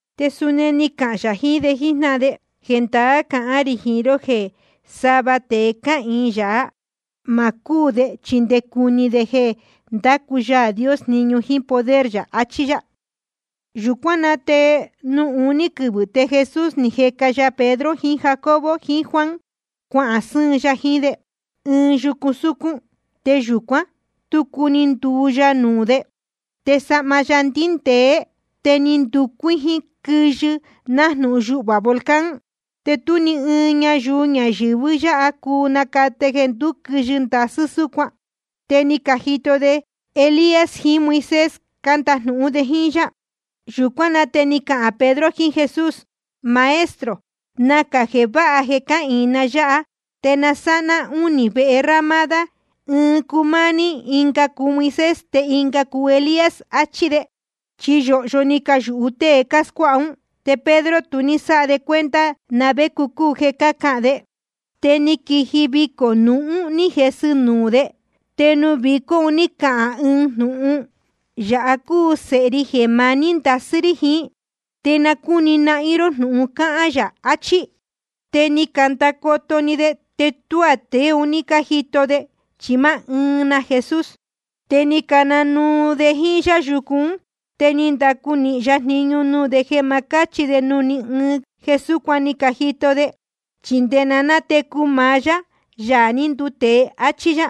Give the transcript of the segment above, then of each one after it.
Te suni ni cahān yā jiín de jíjnáhan de: Jendaá cahán rī jiín ró jeē sava tēe cáhīin yāhá, ma cúū de chi nde cuni de jeē ndácu Yaā Dios jniñu jíín poder yā, achí yá. Yūcuán na te nuū iñú quɨvɨ̄ te Jesús ni jeca ya Pedro jiín Jacobo jiín Juan, cuahān sɨ́ɨn ya jiín de ɨɨn yucu súcún. Te yūcuán, tucu ni nduu ya nuū de. Te sahma ya ni ndindēé, te ni nducuíjín quɨyɨ, nájnūhun yuhvā volcán. Te tú ni ɨɨn ñayuu ñayɨ̄vɨ yáha cuu nacate jeē ndúquɨyɨ ndasɨ́ súcuan. Te ni cajito de jeē Elías jiín Moisés cándajnūhún de jíín yá. Yūcuán na te ni cahān Pedro jiín Jesús: Maestro, nacā jeē váha jeē cáhīin na yáha. Te na sáha ná únī vehe ramada, ɨɨn cuu máá ní, ɨnga cuu Moisés, te ɨnga cuu Elías, achí de. Chi yōhyo ni cayūhu tée cáscuáha ún, te Pedro tu ní sáha de cuenta na vé cúu jeē cahán de. Te ni quiji vicō nūhun ní jesɨ‑ni nuū de. Te nuū vicó un ní cahān ɨɨn jnūhun: Yāha cúu Sēhe ri jeē maní ndasɨ́ rí jiín. Te na cúni nahín ró jnūhun cáhán yā. Achí. Te ni candacoto‑ni de, te tuá tēe un ní cájito de, chi máá ɨɨn na Jesús. Te ni cananuu de jíín yá yucu ún. Te ni ndacu nīhin ya jniñu nuū de jeē ma cáchi de nuū ní ɨɨn jeē súcuan ni cajito de, chi nde na nátecu maá yá, Yaā ní nduu tēe, áchí yá.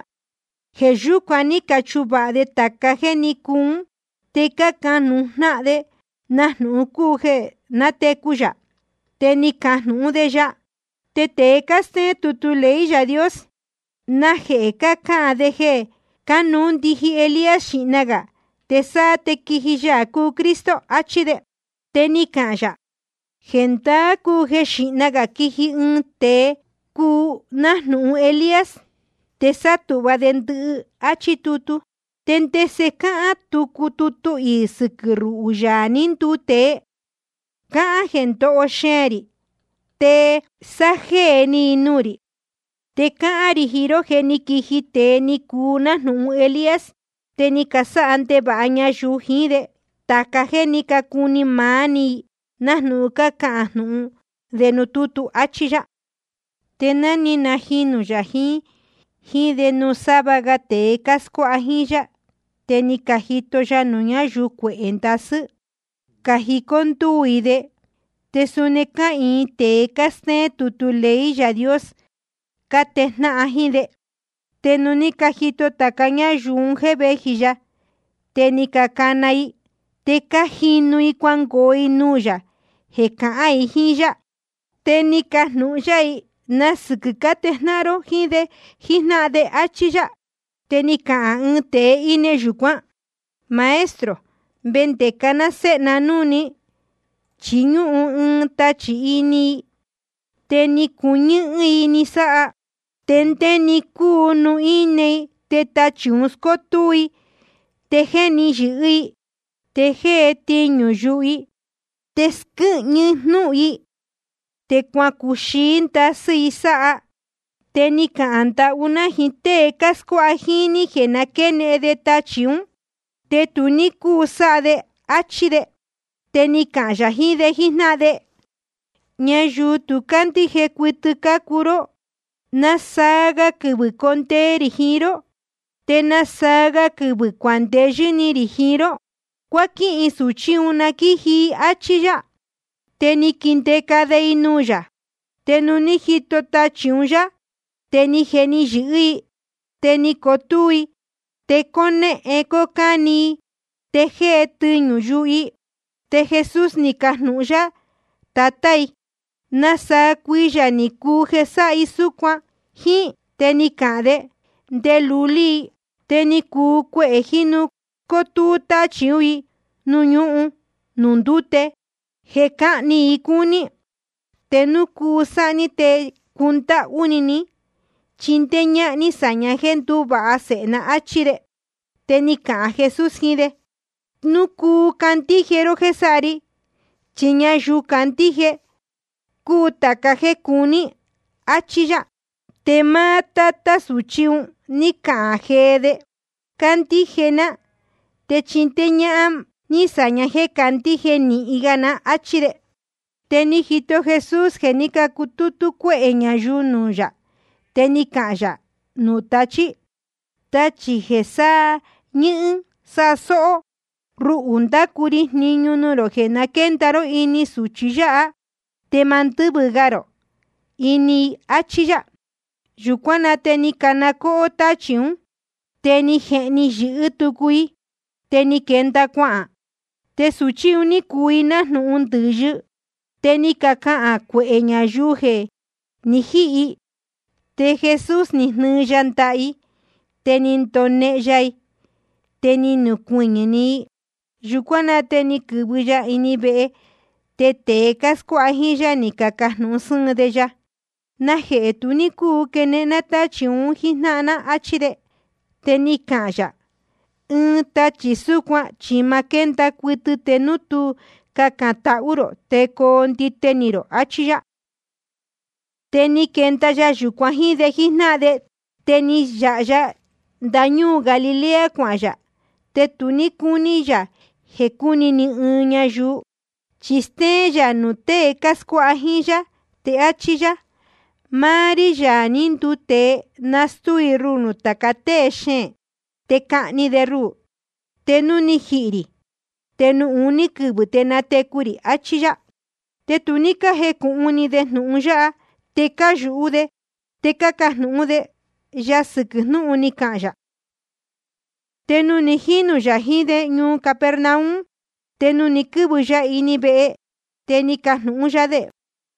Jeē yúcuan ní cachuvāha de tāca jéē ní cuu ún, te cácajnūhun jnáhan de na jnūhun cúu jeē nátecu yā. Te ni cacajnūhún de ya: Te tēe cástéén tutu ley Yaā Dios, ¿najehē cácahān de jeē cánuú ndiji Elías xīhna gā, te sáá te quiji Yaā cúu Cristo? achí de. Te ni cahān yā: Jendaá cúu jeē xíhna gā quiji ɨɨn tēe cúu nájnūhun Elías, te sátūhva de ndɨhɨ, áchí tutu. ¿Te ndese cáhán tucu tutu iī sɨquɨ̄ ruhū, Yaā ní nduu tēe? Cáhán jeē ndoho xeēn rī, te sájéē ni i nuū rī. Te cáhán rī jiín ró jeē jé ni quiji tēe ni cuu nájnūhun Elías, te ni casáha ndevāha ñayuu jiín de tāca jéē ní cacuu ni maá i, nájnūhun cáhán jnūhun de nuū tútu, áchí yá. Te ni najinū yā jiín de nuū sava ga tēe cáscuáha jíín yá, te ni cajito ya ñayuu cuehē ndasɨ́, ni cajicó ndúū i de. Te suni cáhīin tēe cástéén tutu ley Yaā Dios, cátejnáhan jíín de. Te nuū ní cajito tāca ñáyuu un jéē véji ya, te ni canaa ni i. Te cájinu i cuangoo i nuū yā jeē cahān i jíín yá. Te ni cajnūhun yá i: ¿Na sɨquɨ̄ cátejnáhan ró jíín de jíjnáhan de? áchí yá. Te ni cahān ɨɨn tēe íne yūcuán: Maestro, vendeca ná séhe ná núū ní, chi ñúhun ɨɨn tachī ini i, te ni cuñɨ́hɨ́n i ni sáha. Te ndé-ni cúu nuū íne i, te tachī un scótúú i, te jéhni yɨ̄hɨ́‑ni i. Te jée tiñū yuhu i, te squɨ́hñɨ jnúhun i. Te cuacuxií ndasɨ́ i sáha. Te ni cahān ndahú ná jiín tée cáscuáha jíín ní jeē na quénehen de tachī ún, te tu ní cúu sáha de, áchí de. Te ni cahān yā jiín de jíjnáhan de: Ñayuu tu cándíje cuɨtɨ cácuu ró. ¿Nasaa ga quɨvɨ̄ condee rī jiín ró? ¿Te nasaa ga quɨvɨ̄ cuandeyɨ́ ni rī jiín ró? Cuáquihin sūchí un, na quíji i, áchí yá. Te ni caquindeca de i nuū yā. Te nuū ní jito tachī un núū yā, te ni jehni yɨ̄hɨ́‑ni i. Te ni cotúú i, te cónéhén cócáni i, te jée tiñū yuhu i. Te Jesús ni cajnūhun yá tatá i: ¿Nasaa cuiyā ni cuu jeē sáha súcuan jíín i? Te ni cahān de: Nde lulí i. Te ni cuu cuehē jínu scótúú táchī ún i nuū ñuhún nuū ndúte, jeē cáhni i cúní. Te núu cuu sáha ní, te cundáhú ni ní chindéé ñáhán ní sāña jéē ndúvāha sēhe ná, áchí de. Te ni cahān Jesús jiín de: Núu cuu candíje ró jéē sáha ri, chi ñayuu candíje te cuu tāca jéē cuní i, áchí yá. Te máá tátá sūchí un ní cahān jee de: Cándíje ná, te chindéé ñáhán ní sāña jéē candíje nīhin ga ná, áchí de. Te ni jito Jesús jeē ní cutútú cuéhē ñayuu nuū yā. Te ni cahān yā nuū tachí: Tachī jeē sañɨ́hɨ́n sásóhó, ruhū ndácu ri jniñu jeē na quénda ró ini sūchi yáha, te ma ndɨ́vɨ ga rō ini i, áchí yá. Yūcuán na te ni cana cóhó táchī ún, te ni jehni yɨ̄hɨ́ tucu i, te ni quenda cuahān. Te sūchí un ní cuu i nájnūhun ndɨ̄yɨ. Te ni cacahān cuehē ñayuu jeē jé ni jihī i. Te Jesús ni jnɨɨ ya ndaha i, te ni ndonehen ya i, te ni nucuɨñɨ̄‑ni i. Yūcuán na te ni quɨ̄vɨ ya ini ɨɨn vehe, te tēe cáscuáha jíín yá, ni cacajnūhun sɨ́ɨn de ya: ¿Najehē tu ní cúu quenehen ná tachī un jíjnáhan ná? áchí de. Te ni cahān yā: Ɨɨn tachī súcuan chi ma quénda cuɨtɨ te núu tú cacān tahú rō te coo ndite ni rō, achí yá. Te ni quenda ya yūcuan jíín de jíjnáhan de, te ni yāha ya ndañúū Galilea cuahān yā. Te tu ní cúní yā jeē cúni ni ɨɨn ñayuu. Chi stéén yā nuū tée cáscuáha jíín yá, te áchí yá: Máá rí, Yaā ní nduu tēe, nastúu i ruhū nuū tāca tée xeēn. Te cahni de ruhū, te núu ni jihī rī, te nuū uní quɨvɨ̄ te natecu rī, achí yá. Te tu ní cájecūhun ni de jnūhun yáha, te cáyūhú de cajnūhún de ya sɨquɨ̄ jnúhun ni cahān yā. Te ni jinū yā jiín de ñuu Capernaum, te nuū ni quɨ́vɨ ya ini vehe, te ni cajnūhun yá de: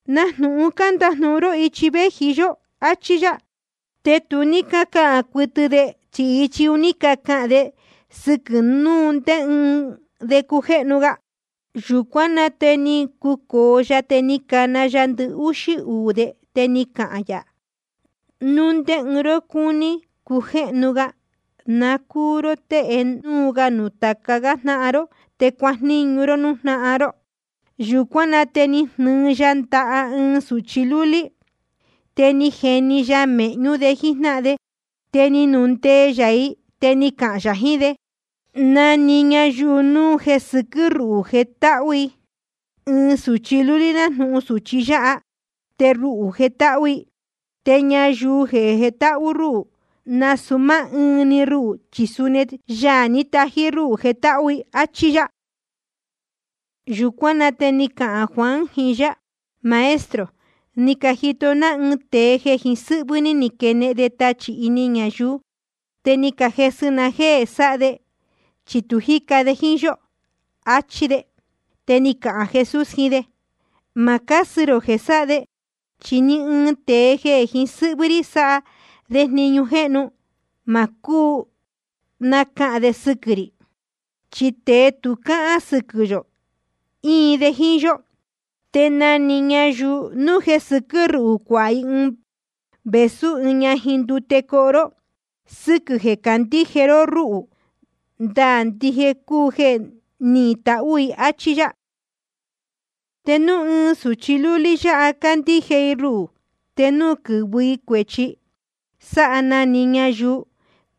¿Na jnūhun ni candajnūhun ró ichi véji yó? áchí yá. Te tu ní cácahān cuɨtɨ de, chi ichi un ní cacahān de sɨquɨ̄ núu ndé ɨɨn de cújéhnu ga. Yūcuán na te ni cucōo ya, te ni cana ya ndɨhúxí uū de, te ni cahān yā: Núu ndé ɨɨn ró cúní cujéhnu ga, na cúu ró tée núu ga nuū tāca jnáhan ró, te cuajníñu ró núū jnáhan ró. Yūcuán na te ni jnɨɨ ya ndaha ɨɨn sūchi lúlí, te ni jeni ya i mēhñú de jíjnáhan de. Te ni nundee yā i, te ni cahān yā jiín de: Na‑ni ñayuu núu jeē sɨquɨ́ ruhū jetáhú i ɨɨn sūchi lúlí nájnūhun sūchi yáha, te ruhū jetáhú i. Te ñayuu jetáhú rúhū, nasūu máá ɨɨn‑ni ruhū, chi suni Yaā ní tají rúhū jetáhú i, áchí yá. Yūcuán na te ni cahān Juan jiín yá: Maestro, ni cajito ná ɨɨn tēe jeē jiín sɨ́hvɨ́ ní quénehen de tachī ini ñayuu. Te ni cajesɨ ná jéē sáha de, chi tu jíca de jíín yó, achí de. Te ni cahān Jesús jiín de: Ma cásɨ rō jeē sáha de. Chi ni ɨɨn tēe jeē jiín sɨ́hvɨ́ rí sáha de jniñu jéhnu, ma cúu nacahān de sɨquɨ̄ rī. Chi tēe tu cáhán sɨquɨ̄ yō, íin de jíín yó. Te na‑ni ñayuu núu jeē sɨquɨ́ ruhū cuāha i vēsú ɨɨn ñajin ndute coho ró, sɨquɨ̄ jeē cácandíje ró ruhū, ndaā ndije cúu jeē nihín i tahū i. Achí yá. ’Te núu ɨɨn sūchi lúlí yáha cándíje i ruhū, te núu quɨ̄vɨ i cuēchi sáha na‑ni ñayuu,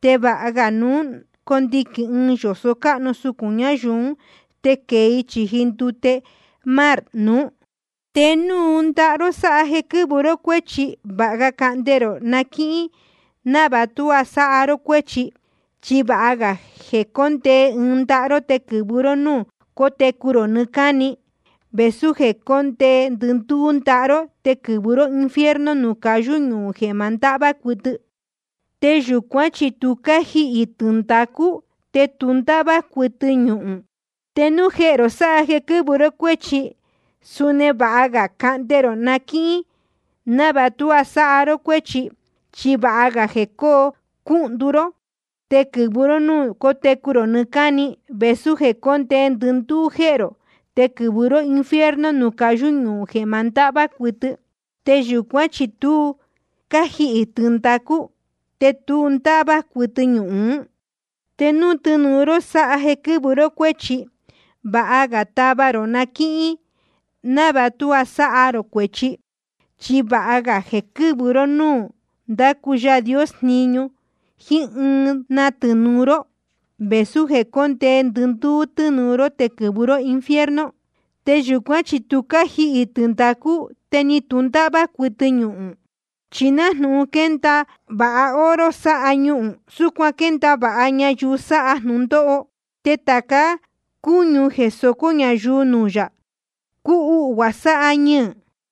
te vāha ga núu ni conuhnī ɨɨn yōso cáhnu sucūn ñayuu ún, te quēe i chīji ndute mar nuú. Te núu ndaha ró sáha jeē quɨ́vɨ ró cuéchi, vāha ga cahnde rō na quíhín, návāha tuá sáha ró cuéchi. Chi vāha ga jeē cóndee ɨɨn‑ni ndaha ró te quɨ̄vɨ ró núū cotecu rō nɨɨ́ cáni, vēsú jeē cóndee ndɨndúú ndaha ró te quɨ̄vɨ ró infierno, nuū cayú ñuhūn jeē ma ndahvá cuɨtɨ. Te yūcuán chi tu cájihī tɨndacú, te tu ndáhvá cuɨtɨ ñuhūn. Te núu jehē rō sáha jeē quɨ́vɨ ró cuéchi, suni vāha ga cahnde rō na quíhín, návāha tuá sáha ró cuéchi. Chi vāha ga jeē cóo cúhndu ró te quɨ̄vɨ ró núū cotecu rō nɨɨ́ cáni, vēsú jeē cóndee ndɨndúú jehē rō te quɨ̄vɨ ró infierno, nuū cayú ñuhūn jeē ma ndahvá cuɨtɨ. Te yūcuán chi tu cájihī tɨndacú, te tu ndáhvá cuɨtɨ ñuhūn. Te núu tɨnūu ró sáha jeē quɨ́vɨ ró cuéchi, vāha ga tava ró na quíhín, návāha tuá sáha ró cuéchi. Chi vāha ga jeē quɨ́vɨ ró ñuu nuū ndácu Yaā Dios jniñu jíín ɨɨn na tɨnūu ró, vēsú jeē cóndee ndɨndúú tɨnūu ró te quɨ̄vɨ ró infierno. Te yūcuán chi tu cájihī tɨndacú, te tu ndáhvá cuɨtɨ ñuhūn. ’Chi nájnūhun quénda vāha oro sáha ñuhūn, súcuan quénda vāha ñayuu sáha jnūndóho. Te tāca cúñu jeē socó ñayuu nuū yā, cúhuhvuā sáha ñɨɨ̄.